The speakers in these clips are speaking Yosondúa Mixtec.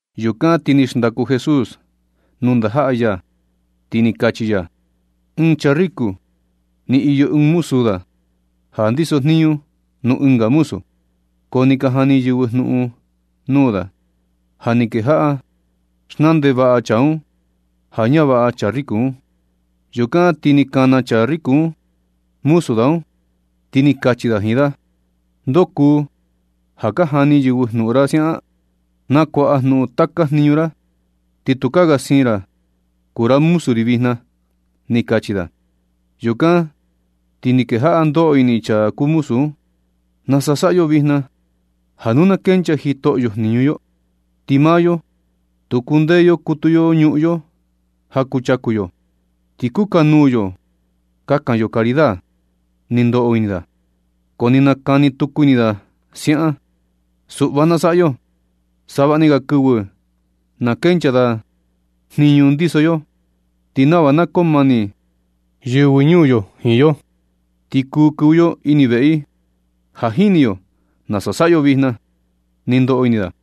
Yukan ti ni xndaku Jesús nuu ndajaꞌa ya, ti ni kachi ya: ―Ɨɨn chaa riku, ni iyo ɨɨn muzu da ja ndiso jniñu nuu ɨnga muzu, ko ni ka jani yɨvɨ jnuꞌun nuu da ja ni kejaꞌa xnaa ndevaꞌa chaa un ja ñavaꞌa chaa riku un. Yukan ti ni kana chaa riko un muzu da un, ti ni kachi da jiin da: “¿Ndoo kuu ja ka jani yɨvɨ jnuꞌun ra siaꞌan? Nakuaꞌa jnuꞌun taka jniñu ra, ti tukaa ga siin ra kuu ra muzu ri vijna na”, ni kachi da. Yukan na ti ni kejaꞌa ndoꞌo ini chaa kuu muzu un: “¿Nasa saꞌa yo vijna na, ja nu na kenchaa jitoꞌo yo jniñu yo? Ti maa yo, tu kundee yo kutu yo nuu ñuꞌun yo ja kuchaku yo. Ti kukanuu yo kakan yo caridad”, ni ndoꞌo ini da. Ko ni nakani tuku ini da siaꞌan: “Suꞌva na saꞌa yo savaꞌa ni ga kɨvɨ na kenchaa da jniñu ndiso yo, ti nava na koo mani yɨvɨ ñuu yo jiin yo, ti kuu kɨvɨ yo ini veꞌe i. Ja jini yo nasa saꞌa yo vijna”, ni ndoꞌo ini da.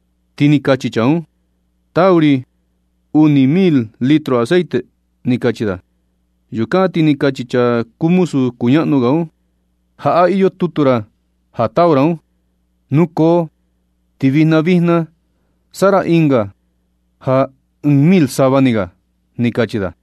Ti ni kachi chaa un: “Tau ri uni mil litro aceite”, ni kachi da. Yukan ti ni kachi muzu kuñaꞌnu ga un: “Jaꞌa iyo tutu ra ja tau ra un, nukoo ti vijna vijna saꞌa ra ɨnga ja ɨɨn mil sava ni ga”, ni kachi da.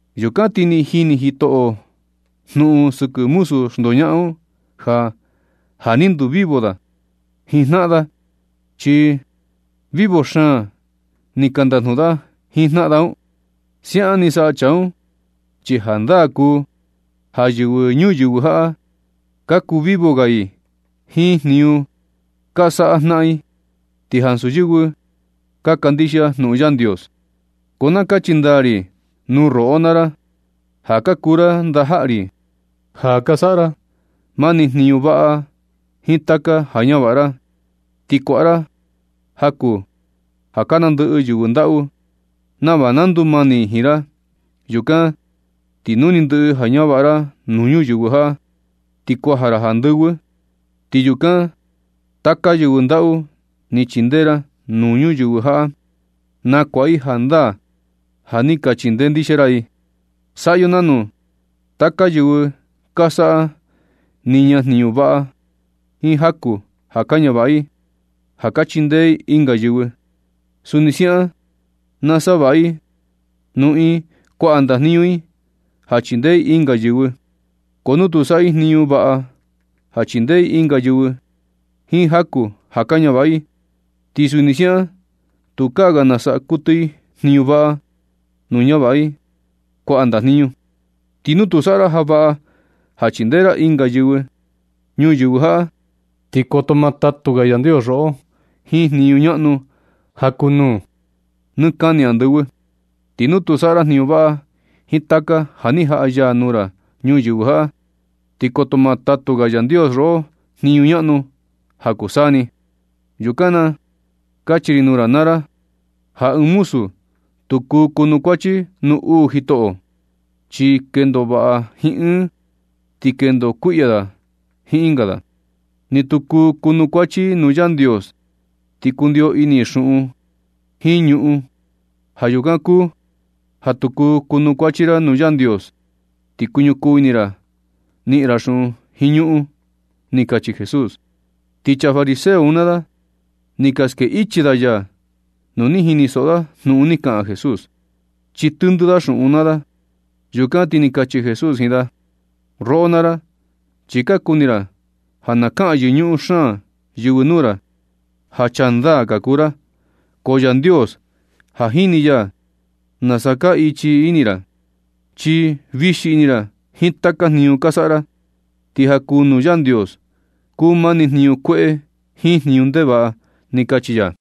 Yukan ti ni niꞌin jitoꞌo un jnuꞌun sɨkɨ muzu xndoñaꞌan un ja, ja ni ndu vivo da jiin jnaꞌan da, chi vivo xaan ni ka ndajnuꞌun da jiin jnaꞌan da un. Siaꞌan ni saꞌa chaa un chi jandaa kuu ja yɨvɨ ñuyɨvɨ jaꞌa, ka kuu vivo ga i jiin jniñu ka saꞌa jnaꞌan i, ti ansu yɨvɨ ka kandixia jnuꞌun Yandios. Ko na kachi ndaa ri nuu roꞌo naa ra, ja ka kuu ra ndajaꞌa ri, ja ka saꞌa ra mani jniñu vaꞌa jiin taka ja ñavaꞌa ra. Ti kuaꞌa ra jaku ja ka nandɨꞌɨ yɨvɨ ndaꞌu nava na ndumani i jiin ra. Yukan ti nu ni ndɨꞌɨ ja ñavaꞌa ra nuu ñuyɨvɨ jaꞌa, ti kuaja ra andɨvɨ, ti yukan, taka yɨvɨ ndaꞌu ni chindee ra ñuyɨvɨ jaꞌa, na kuaꞌa i jandaa ja ni ka chindee ndixia ra i. Saꞌa yo nanu. Taka yɨvɨ ka saꞌa niña jniñu vaꞌa jiin jaku ja ka ñavaꞌa i ja ka chindee i ɨnga yɨvɨ, suni siaꞌan na saꞌa vaꞌa i nu iin kuaꞌa ndajniñu i ja chindee i ɨnga yɨvɨ. Ko nu tu saꞌa i jniñu vaꞌa ja chindee i ɨnga yɨvɨ jiin jaku ja ka ñavaꞌa i, ti suni siaꞌan tukaa ga na saꞌa kuɨtɨ i jniñu vaꞌa nu ñavaꞌa i kuaꞌa ndajniñu. Ti nu tu ni saꞌa ra ja vaꞌa ja chindee ra ɨnga yɨvɨ ñuyɨvɨ jaꞌa, ti koto ma tatu ga Yandios roꞌo jiin jniñu ñaꞌnu ja kuu nuu nɨ kani andɨvɨ. Ti nu tu saꞌa ra jniñu vaꞌa jiin taka ja ni jaꞌa ya nuu ra ñuyɨvɨ jaꞌa, ti koto ma tatu ga Yandios roꞌo jniñu ñaꞌnu ja kuu saa ni. Yukan na kachi ri nuu ra naa ra ja ni ɨɨn muzu tu kuu kuanukuachi nuu uu jitoꞌo, chi kendo vaꞌa jiin ɨɨn da, ti kendo kuiꞌya i jiin ɨnga da. Ni tu kuu kuanukuachi i nuu Yandios, ti kundio ini i xuꞌun jiin ñuꞌun. Ja yukan kuu ja tu kuu kuanukuachi ra nuu Yandios, ti kuñukuu ini ra niꞌin ra xuꞌun jiin ñuꞌun ―ni kachi Jesús. Ti chaa fariseo un naa da, ni ka skee ichi da ya nu ni jinisoꞌo da jnuꞌun ni kaꞌan Jesús, chi tɨndɨ da xuꞌun naa da. Yukan ti ni kachi Jesús jiin da: ―Roꞌo naa ra, chi ka kuni ra ja na kaꞌan yɨñuꞌun xaan yɨvɨ nuu ra ja chaa ndaa ka kuu ra. Ko Yandios, ja jini ya nasa kaa ichi ini ra. Chi vixi ini ra jiin taka jniñu ka saꞌa ra, ti ja kuu nuu Yandios kuu mani jniñu kueꞌe jiin jniñu ndevaꞌa ―ni kachi ya.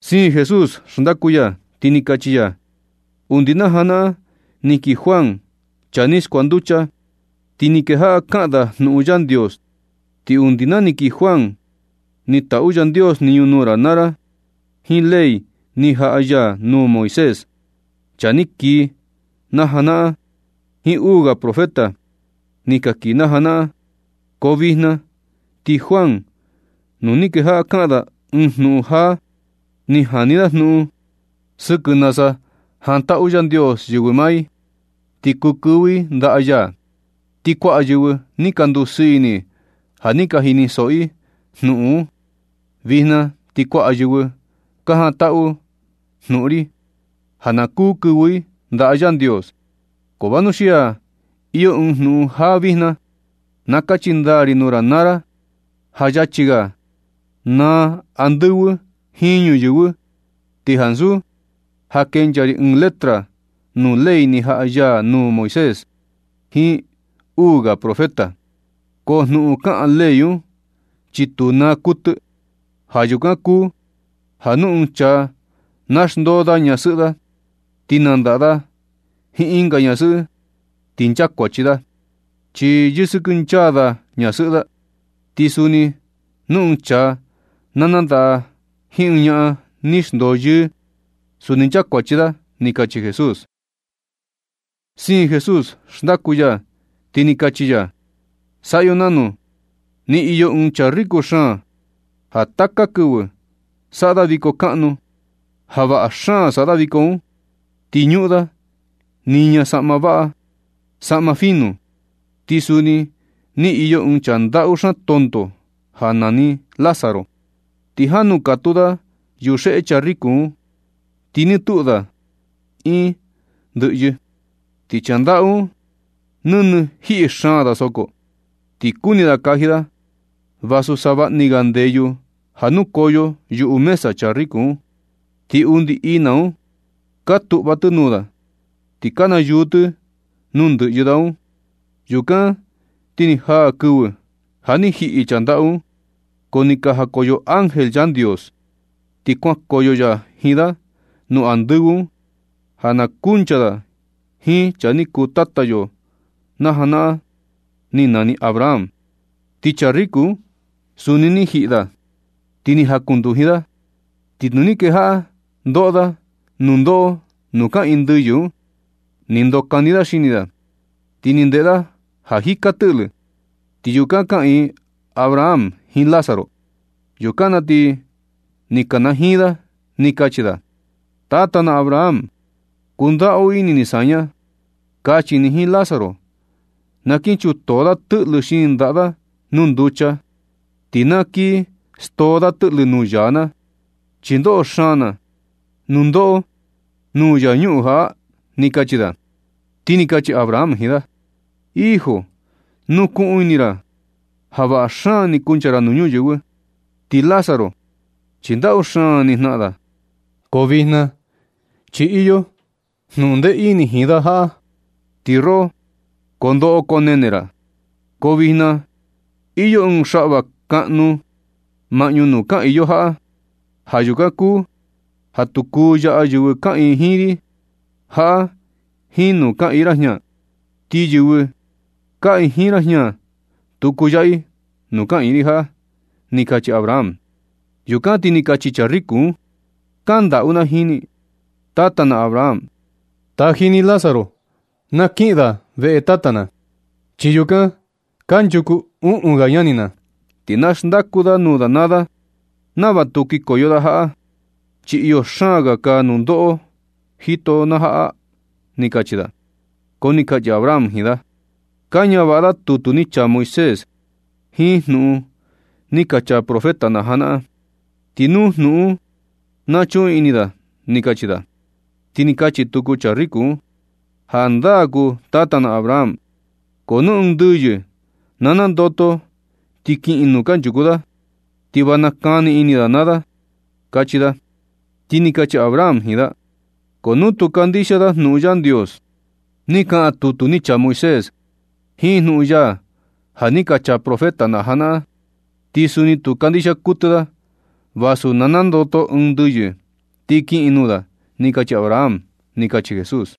Siin Jesús xndaku ya, ti ni kachi ya: ―Undi naa janaꞌan ni kii Juan, chaa ni skuanducha, ti ni kejaꞌa kaꞌan da jnuꞌun Yandios. Ti undi naa ni kii Juan ni taꞌu Yandios jniñu nuu ra naa ra jiin ley ni jaꞌa ya nuu Moisés, chaa ni kii na janaꞌan jiin uu ga profeta ni ka kii na janaꞌan. Ko vijna, ti Juan nu ni kejaꞌa kaꞌan da ɨɨn jnuꞌun jaa, ni jani da jnuꞌun sɨkɨ nasa jantaꞌu Yandios yɨvɨ naa i, ti kuu kɨvɨ i ndaꞌa ya. Ti kuaꞌa yɨvɨ ni ka ndusɨɨ ini i ja ni ka jinisoꞌo i jnuꞌun un. Vijna ti kuaꞌa yɨvɨ ka jantaꞌu i jnuꞌun ri, ja na kuu kɨvɨ i ndaꞌa Yandios. Ko vanuxia ja iyo ɨɨn jnuꞌun jaa vijna. Na kachi ndaa ri nuu ra naa ra, ja yachi ga naa andɨvɨ jiin ñuyɨvɨ ti ansu ja na kenchaa ɨɨn letra nuu ley ni jaꞌa ya nuu Moisés jiin uu ga profeta. Ko jnuꞌun kaꞌan ley un, chi tu naa kuɨtɨ. Ja yukan kuu ja nu ɨɨn chaa na xndoo da ñasɨꞌɨ da, ti nandaꞌa da jiin ɨnga ñasɨꞌɨ ti nchakuachi da, chi yɨsɨkɨ nchaa da ñasɨꞌɨ da. Ti suni nu ɨɨn chaa na nandaꞌa jiin ɨɨn ñaꞌan ni xndoo yɨɨ, suni nchakuachi da ―ni kachi Jesús. Siin Jesús xndaku ya, ti ni kachi ya: ―Saꞌa yo nanu. Ni iyo ɨɨn chaa riku xaan ja taka kɨvɨ saꞌa da viko kaꞌnu, ja vaꞌa xaan saꞌa da viko un, ti ñuꞌun da niña saꞌma vaꞌa, saꞌma fina. Ti suni ni iyo ɨɨn chaa ndaꞌu xaan tonto ja ni nani Lázaro, ti jan nukatuu da yuxeꞌe chaa riko un, ti nɨ tuꞌu da iin ndɨꞌyɨ. Ti chaa ndaꞌu un, nɨnɨ jiꞌi xaan da soko, ti kuni da kaji da vasu savaꞌa ni ga ndeyu ja nukoyo yuꞌu mesa chaa riku un. Ti undi ina un ka tuꞌva tɨ nuu da, ti ka nayuu tɨ nuu ndɨꞌyɨ da un. Yukan ti ni jaa kɨvɨ ja ni jiꞌi chaa ndaꞌu un, ko ni jakoyo ángel Yandios ti kuankoyo ya jiin da nuu andɨvɨ un ja na kuncha da jiin chaa ni kuu tata yo na janaꞌan ni nani Abraham. Ti chaa riku un suni ni jiꞌi da, ti ni jakununduji da. Ti nu ni kejaꞌa ndoꞌo da nundoꞌo nuu kaꞌiin ndɨyɨ un, ni ndokani da xini da, ti ni ndeꞌe da ja jika tɨꞌlɨ, ti yukan kaꞌiin Abraham jiin Lázaro. Yukan na ti ni kanajiin da, ni kachi da: “Tata na Abraham, kundaꞌu ini ni saña. Kachi ni jiin Lázaro na kin chutoo da tɨꞌlɨ xini ndaꞌa da nuu nducha, ti na kii stoo da tɨꞌlɨ nuu yaa na, chi ndoꞌo xaan na nundoꞌo nuu yaa ñuꞌun jaꞌa”, ni kachi da. Ti ni kachi Abraham jiin da: “Hijo, nukuꞌun ini ja vaꞌa xaan ni kuncha ra nuu ñuyɨvɨ, ti Lázaro chi ndaꞌu xaan ni jnaꞌan da. Ko vijna chi iyo jnuꞌun ndee ini jiin da jaꞌa, ti roꞌo ko ndoꞌo ko nene ra. Ko vijna iyo ɨɨn xaꞌva kaꞌnu maꞌñu nuu kaꞌiin yo jaꞌa, ja yukan kuu ja tu kuu yaꞌa yɨvɨ kaꞌiin jiin ri jaꞌa jiin nuu kaꞌiin ra jña. Ni yɨvɨ kaꞌiin jiin ra jña tu ku yaꞌa i nuu kaꞌiin ri jaꞌa”, ni kachi Abraham. Yukan na ti ni kachi chaa riku un: “Kaꞌan ndaꞌu na jiin ni, tata na Abraham. Taji ni Lázaro na kiꞌin da veꞌe tata na, chi yukan kanchuku uꞌun ga ñani na. Ti na xndaku da nuu da naa da nava tu kikoyo da jaꞌa, chi iyo xaan ga kaa nundoꞌo jito na jaꞌa”, ni kachi da. Ko ni kachi Abraham jiin da: “Ka ñavaꞌa da tutu ni chaa Moisés jiin jnuꞌun ni ka chaa profeta na janaꞌan, ti nuu jnuꞌun un na chuꞌun ini da”, ni kachi da. Ti ni kachi tuku chaa riku un: “Jandaa kuu un, tata na Abraham, ko nu ɨɨn ndɨyɨ na nandoto ti kiꞌin nuu kanchuku da, ti va nakani ini da naa da”, kachi da. Ti ni kachi Abraham jiin da: “Ko nu tu ka kandixia da jnuꞌun Yandios ni kaꞌan tutu ni chaa Moisés, jiin jnuꞌun ya ja ni ka chaa profeta na janaꞌan, ti suni tu kandixia kuɨtɨ da vasu na nandoto ɨɨn ndɨyɨ ti kiꞌin nuu da”, ni kachi Abraham ―ni kachi Jesús.